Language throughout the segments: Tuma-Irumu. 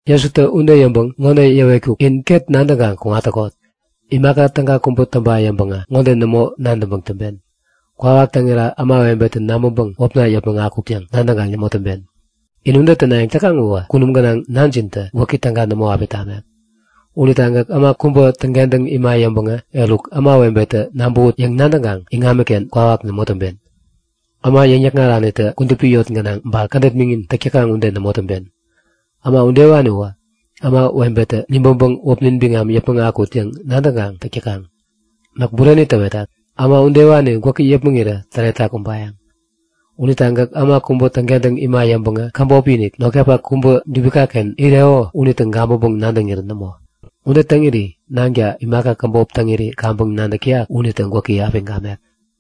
Jesutä ude yäŋpäŋ ŋode yäwetkuk; In ket nadäŋkaŋ kuŋat täkot. Imaka täga kubä täŋpa yäŋpäŋä ŋode nämo nadäŋpäŋ täŋpen; Kwawak täŋira ämawebetä nabäŋpäŋ wäpna yäpmäŋ akut yäŋ nadäŋkaŋ nämo täŋpen. In ude tänayäŋ täkaŋ uwä kunum gänaŋ Nanjintä gwäki täga nämo api tamek. Unita gäk äma kubä täŋkentäŋ ima yäŋpäŋä eruk ämawebetä nabäwut yäŋ nadäŋkaŋ iŋamiken kwawak nämo täŋpen. Äma yäŋ-yäkŋaranitä kudupi yot gänaŋ ba kädet miŋin täk täkaŋ ude nämo täŋpen. Äma udewaniwä ämawebetä nibäŋpäŋ wäpnin biŋam yäpmäŋ akut yäŋ nadäŋkaŋ täk täkaŋ. Näk bureni täwetat. Äma udewani gwäki yäpmäŋirä täretak ubayäŋ! Unita gäk äma kubä täŋkentäŋ ima yäŋpäŋä käbop-inik, notkapak kubä dubika-ken ireko unitä gabäŋpäŋ-nadäŋirän nämo. Ude täŋiri Nanka, imaka käbop täŋiri kaŋpäŋ nadäk täyak unitä gwäki api gamek.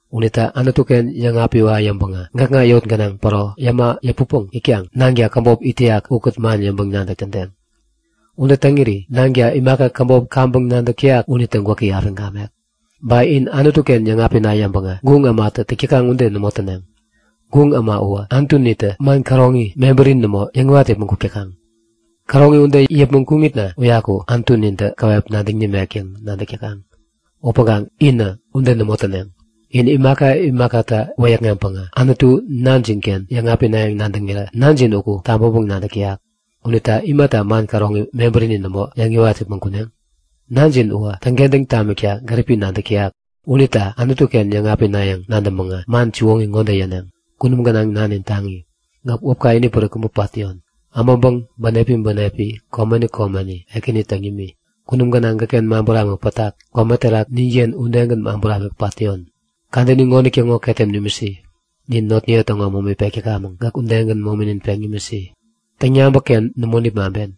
Unita Anutu-ken yäŋapiwa yäŋpäŋä gäkŋa yot gänaŋ päro yäma yäputpäŋ itkaŋ Nanka käbop it täyak ukät man yäŋpäŋ-nadäk tädeŋ. Ude täŋiri Nanka imaka käbop kaŋpäŋ nadäk täyak unitä gwäki api gamek. Ba in Anutu-ken yäŋapina yäŋpäŋä guŋ ämatä täk täkaŋ ude nämo täneŋ. Guŋ äma uwä anutunita man käroŋi, mebärini nämo yäŋiwat yäpmäŋ kuk täkaŋ. Käroŋi ude yäŋ yäpmäŋ kuŋitna uyaku anutunintä käwep nadäŋ nimek yäŋ nadäk täkaŋ. Upäŋkaŋ inä ude nämo täneŋ. In imaka imakata wäyäkŋeŋpäŋ Anutu Nanjinken yäŋapinayäŋ nadäŋirä Nanjin uku tabäŋpäŋ-nadäk täyak. Unita imata man käroŋi mebärini nämo yäŋiwat yäpmäŋ kuneŋ? Nanjin uwä täŋkentäŋ tamikta gäripi nadäk täyak. Unita Anutu-ken yäŋapinayäŋ nadäŋpäŋä man siwoŋi ŋode yäneŋ; Kunum gänaŋ Nanin taŋi, Gäk wäpka inipärik kubä pat täyon. Äbäŋpäŋ bänepi bänepi, komeni komeni Ekäni täŋ nimi. Kunum gänaŋ gäkken man buramik pätak, kome terak ninken udegän man buramik pat täyon. Kadäni ŋonitäŋo ketem nimisi. Nin notniye täŋo momi pek täkamäŋ, gäk udegän mominin peŋ nimisi. Täŋyabäk-ken nämo nipmaŋpen.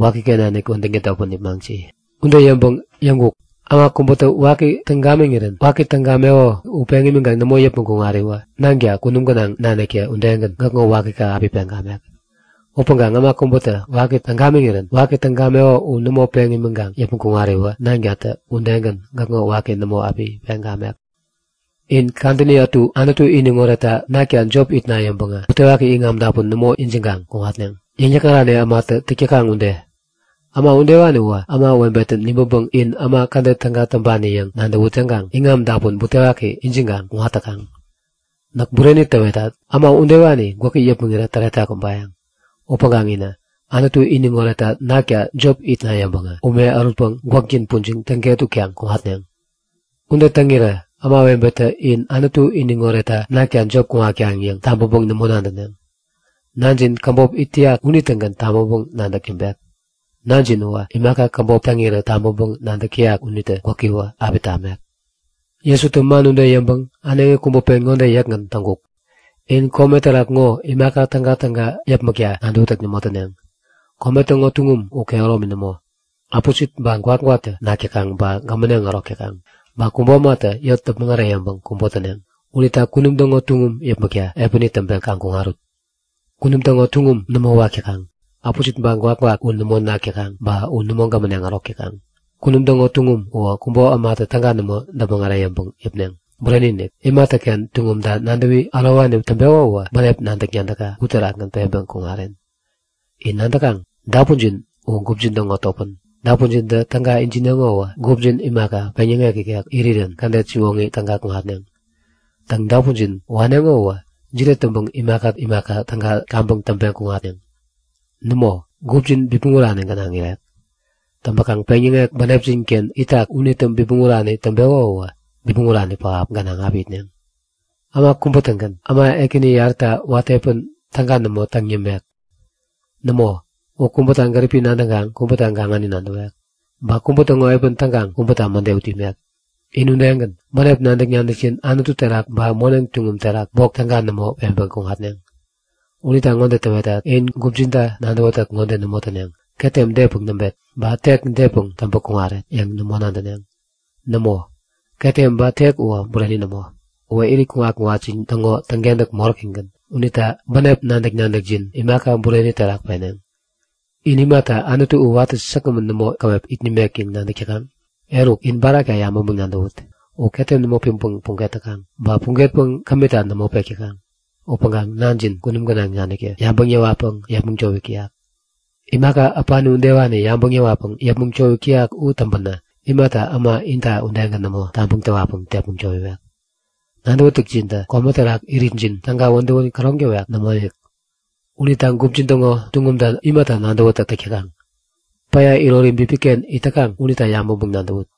Wakiken nanik wädäŋ tädotpäŋ nipmaŋsi. Ude yäŋpäŋ yäŋkuk; Äma kubätä waki täŋ gamiŋirän, waki täŋ gameko u peŋ imiŋkaŋ nämo yäpmäŋ kuŋariwä Nanka kunum gänaŋ naniktä udegän gäkŋo wakika api peŋ gamek. Upäŋkaŋ äma kubätä waki täŋ gamiŋirän waki täŋ gameko u nämo peŋ imiŋkaŋ yäpmäŋ kuŋariwä Nankatä udegän gäkŋo waki nämo api peŋ gamek. In kadäni ätu Anutu iniŋ oretta nakta jop itna yäŋpäŋä butewaki iŋam dapun nämo ijiŋkaŋ kuŋatneŋ, yäŋ-yäkŋarani ämatä täk täkaŋ ude. Äma udewani uwä ämawebetä nibäŋpäŋ in äma kädet täga täŋpani yäŋ nadäwut yäŋkaŋ iŋam dapun butewaki ijiŋkaŋ kuŋat täkaŋ. Näk bureni täwetat. Äma udewani gwäki yäpmäŋirä täretak ubayäŋ! Upäŋkaŋ inä, Anutu iniŋ oretta nakta jop itna yäŋpäŋä ume ärutpäŋ gwäkjin pujiŋ täŋket utkaŋ kuŋatneŋ. Ude täŋirä ämawebetä in Anutu iniŋ oretta nakta jop kuŋatkaŋ yäŋ tabäŋpäŋ nämo nadäneŋ. Nanjin käbop it täyak unitägän tabäŋpäŋ-nadäk täŋpek. Nanjin uwä imaka käbop täŋirä tabäŋpäŋ-nadäk täyak unitä gwäkiwä api tamek. Jesutä man ude yäŋpäŋ äneŋi kubä pen ŋode yäkgän täŋkuk; In kome terak ŋo imaka tägatäga yäpmäkta nadäwätäk nämo täneŋ. Kome täŋo tuŋum u kehäromi nämo. Äpusit ba gwakgwaktä nak täkaŋ ba gämäneŋ ärok täkaŋ. Ba kubo ämatä yot däpmäŋ äreyäŋpäŋ kubo täneŋ. Unita kunum täŋo tuŋum yäpmäkta epäni täŋpeŋ kaŋ kuŋarut. Kunum täŋo tuŋum nämo wak täkaŋ. Äpusit ba gwakgwak u nämo nak täkaŋ ba u nämo gämäneŋ ärok täkaŋ. Kunum täŋo tuŋum uwä kubo ämatä täga nämo däpmäŋ äreyäŋpäŋ yäpneŋ. Bureni-inik, imatäken tuŋumta nadäwi ärowani täŋpeko uwä bänep nadäk-nadäkka uterakgän peŋpäŋ kuŋaren. In nadäkaŋ? Dapunjin u gupjin täŋo topän. Dapunjintä täga ijineŋo uwä gupjin imaka, peŋyäŋek ikek irirän kädet siwoŋi täga kuŋatneŋ. Täŋ, dapunjin waneŋo uwä jide täŋpäŋ imaka imaka täga kaŋpäŋ täŋpeŋ kuŋatneŋ? Nämo, gupjin bipmäŋ urani gänaŋ irek. Täŋpäkaŋ peŋyäŋek bänepjin-ken itak unitä bipmäŋ urani täŋpeko uwä bipmäŋ urani pähap gänaŋ api itneŋ. Äma kubä-tägän äma ekäni yaräta watä epän täga nämo täŋ yämek. Nämo, u kubäta gäripi nadäŋkaŋ kubäta gaŋani nadäwek. Ba kubä täŋo epän täŋkaŋ kubäta mäde ut imek. In udegän, bänep nadäk-nadäkjin Anutu terak ba moneŋ tuŋum terak bok täga nämo peŋpeŋ kuŋatneŋ. Unita ŋode täwetat; In gupjinta nadäwätäk ŋode nämo täneŋ; Ketem depäŋ näŋpet? Ba tek depäŋ täŋpäŋ kuŋaret? yäŋ nämo nadäneŋ. Nämo, ketem ba tek uwä bureni nämo. Uwä irit kuŋat-kuŋatjin täŋo täŋkentäk moräkigän. Unita bänep nadäk-nadäkjin imaka bureni terak peneŋ. In imata Anutu u watä säkgämän nämo käwep it nimek yäŋ nadäk täkaŋ? Eruk, in barakta yabäŋpäŋ-nadäwut! U ketem nämo piŋpäŋ puget täkaŋ ba pugetpäŋ kämita nämo pek täkaŋ. Upäŋkaŋ Nanjin kunum gänaŋ naniktä yabäŋ yäwatpäŋ yepmäŋ towik täyak. Imaka äpani udewani yabäŋ yäwatpäŋ yepmäŋ towik täyak u täŋpänä imata äma inta udegän nämo tabäŋ täwatpäŋ tepmäŋ towiwek? Nadäwätäkjintä kome terak iritjin täga wädäwän käroŋ täwek? Nämoinik! Unita gupjin täŋo tuŋumta imata nadäwätäk täk täkaŋ? Päya irori bipiken it täkaŋ unita yabäŋpäŋ-nadäwut!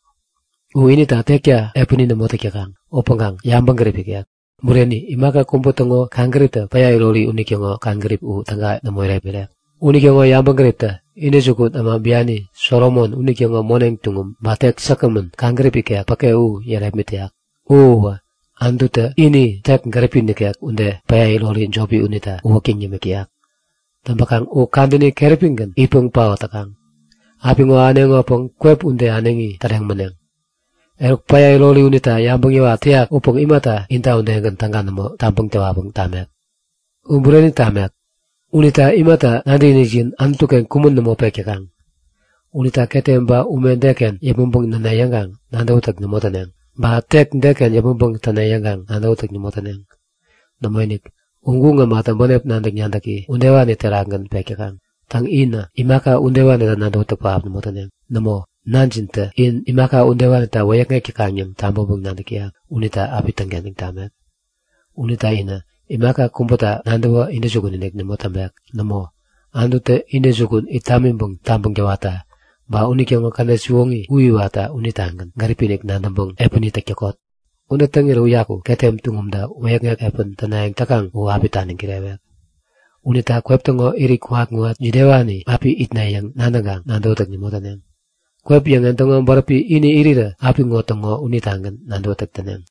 U inita tekta epäni nämo täk täkaŋ upäŋkaŋ yabäŋgärip ikek. Bureni, imaka kubä täŋo kaŋgäriptä päya irori unitäŋo kaŋgärip u täga nämo irepmirek. Unitäŋo yabäŋgäriptä intäjukun äma biani Solomon unitäŋo moneŋ tuŋum ba tek säkgämän kaŋgärip ikek päke u yärepmit täyak. U uwä Anututä ini tek gäripi nikek ude päya irori jopi unita uwäktäŋ yämik täyak. Täŋpäkaŋ u kadäni keräpigän itpäŋ paot täkaŋ. Apiŋo ahäneŋopäŋ kwep ude äneŋi täreŋ mäneŋ. Eruk, päya irori unita yabäŋ yäwat täyak upäŋ imata inta udegän täga nämo tabäŋ täwatpäŋ tamek? U bureni tamek! Unita imata nadäkinikjin Anutu-ken kumän nämo pek täkaŋ? Unita ketem ba ume deken yäpmäŋpäŋ näne yäŋkaŋ nadäwätäk nämo täneŋ. Ba tek deken yäpmäŋpäŋ täne yäŋkaŋ nadäwätäk nämo täneŋ. Nämoinik! U guŋ ämatä bänep nadäk-nadäki udewani terakgän pek täkaŋ. Täŋ, inä imaka udewanita nadäwätäk pähap nämo täneŋ. Nämo, nanjintä in imaka udewanita wäyäkŋek täkaŋ yäŋ tabäŋpäŋ-nadäk täyak unita api täŋkentäŋ tamek. Unita inä imaka kubäta nadäwä intäjukun nämo täŋpek. Nämo, Anututä intäjukun it tamiŋpäŋ tabäŋ täwatta ba unitäŋo kädet siwoŋi u iwatta unitagän gäripi-inik nadäŋpäŋ epäni täk täkot. Ude täŋirä uyaku ketem tuŋumta wäyäkŋek epän tänayäŋ täkaŋ u api taniŋ kirewek. Unita kwep täŋo irit kuŋat-kuŋat jidewani api itneŋ yäŋ nadäŋkaŋ nadäwätäk nämo täneŋ. Kwep yäŋen täŋo bäräpi ini irirä apiŋo täŋo unitagän nadäwätäk täneŋ.